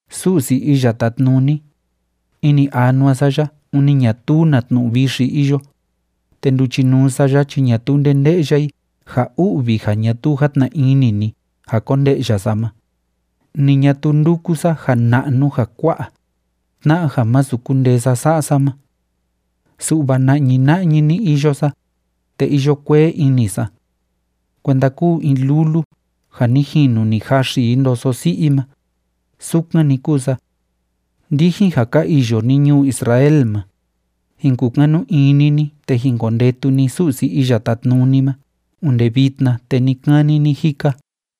Su'si Iya Tátnuni, ini anua sa ya ûni ñatuu na tnu'u vixi iyo, te nduchinuu sa ya chi ñatuu nde nde'ya i ja u'vi ja ñatuu játna ini ni ja konde'ya sa ma, ni ñatuu ndúku sa ja na'nu ja kua'a, tna'a ja masu kundee sa sa'a sa ma. Su'va na'ñi na'ñi‑ni iyo sa, te iyo kuee ini sa. Kuenda kúu in lulu ja ni jinu ni jaxi i ndoso si'i i ma, sukan‑ni kúu sa. Ndijin ja ka iyo ni ñuu Israel ma, jin kukanu ini ni te jin kondetu ni Su'si Iya Tátnuni ma onde vitna te ni‑kani ni‑jika.